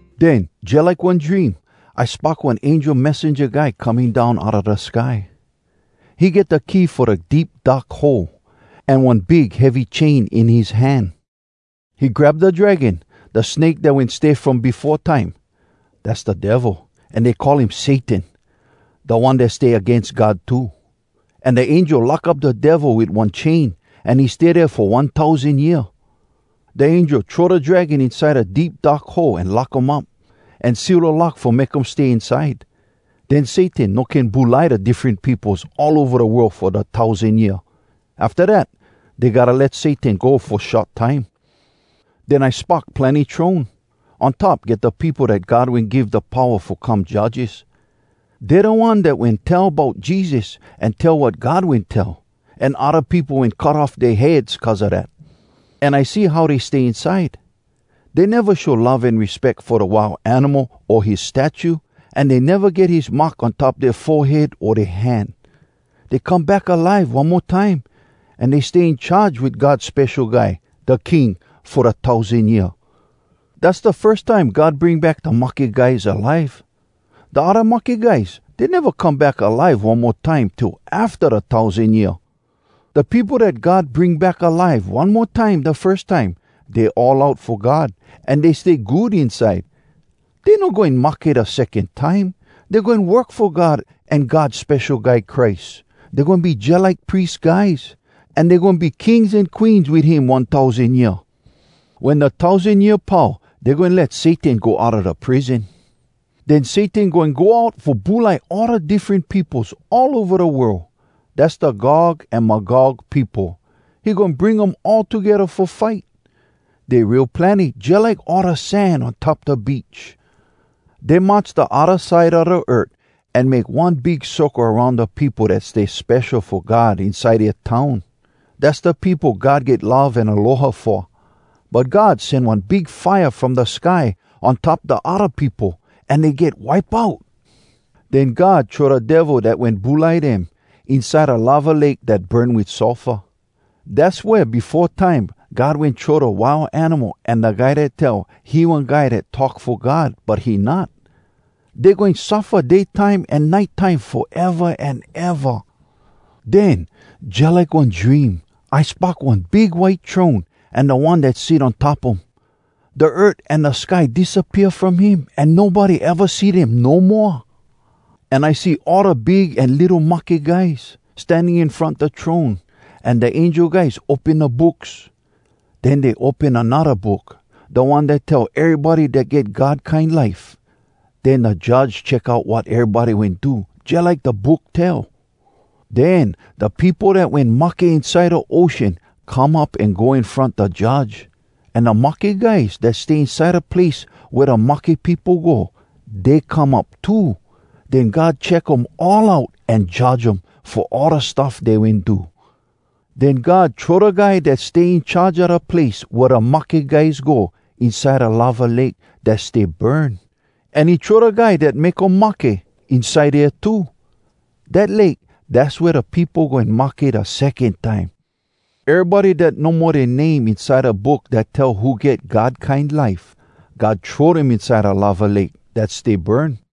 Den, jalike one dream, I spock one angel messenja guy coming down outa da sky. He get da key fo da Deep Dark Hole, an one big heavy chain in his hand. He grab da Dragon, da snake dat wen stay from befo time. Dass da Devil, an dey call him Satan, Da One Dat Stay Agains God too. An da angel lock up da Devil wit one chain, an he stay dea fo one tousan year. Da angel throw da Dragon inside da Deep Dark Hole an lock um up, an seal da lock fo make um stay inside. Den Satan no can bulai da diffren peopos all ova da world fo da tousan year. Afta dat, dey gotta let Satan go fo short time. Den I spock plenny throne. On top get da peopo dat God wen give da powa fo come judges. Dey da one dat wen tell bout Jesus, an tell wat God wen tell, an odda peopo wen cut off dea heads cuz a dat. An I see how dey stay inside. Dey neva show love an respeck fo da Wild Animal o his statue, an dey neva get his mark on top dea forehead o dea hand. Dey come back alive one mo time, an dey stay in charge wit God Spesho Guy, da King, fo da tousan year. Dass da firs time God bring back da mahke guys alive. Da odda mahke guys, dey neva come back alive one mo time till afta da tousan year. Da peopo dat God bring back alive one mo time da firs time, dey all out fo God, an dey stay good inside. Dey no goin mahke da secon time. Dey goin work fo God an God Spesho Guy Christ. Dey goin be jalike pries guys, an dey goin be kings an queens wit him one tousan year. Wen da tousan year pau, dey goin let Satan go outa da prison. Den Satan goin go out fo bulai all da diffren peopos all ova da world. Dass da Gog an Magog peopo. He goin bring um all togedda fo fight. Dey real plenny—jalike all da sand on top da beach. Dey march da odda side a da earth, an make one big circle aroun da peopo dat stay spesho fo God inside dea town. Dass da peopo God get love an aloha fo. But God sen one big fire from da sky on top da odda peopo, an dey get wipe out. Den God throw da Devil dat wen bulai dem, inside da lava lake dat burn wit sulfur. Dass wea befo time God wen throw da Wild Animal an da guy dat tell he one guy dat talk fo God, but he not. Dey goin suffa day time an nite time foeva an eva. Den, jalike one dream, I spock one big white throne, an da One dat sit on top um. Da earth an da sky disappea from him, an nobody eva see dem no moa. An I see all da big an litto mahke guys, standing in front da throne. An da angel guys open da books. Den dey open anodda book, da one dat tell erybody dat get God kine life. Den da Judge check out wat erybody wen do, jalike da book tell. Den da peopo dat wen mahke inside da ocean come up an go in front da Judge. An da mahke guys dat stay inside da place wea da mahke peopo go, dey come up too. Den God check um all out an judge um, fo all da stuff dey wen do. Den God throw da guy dat stay in charge a da place wea da mahke guys go, inside da lava lake dat stay burn. An he throw da guy dat make um mahke inside dea too. Dat lake, dass wea da peopo goin mahke da secon time. Erybody dat no mo dea name inside Da Book Dat Tell Who Get God Kine Life, God throw dem inside da lava lake dat stay burn.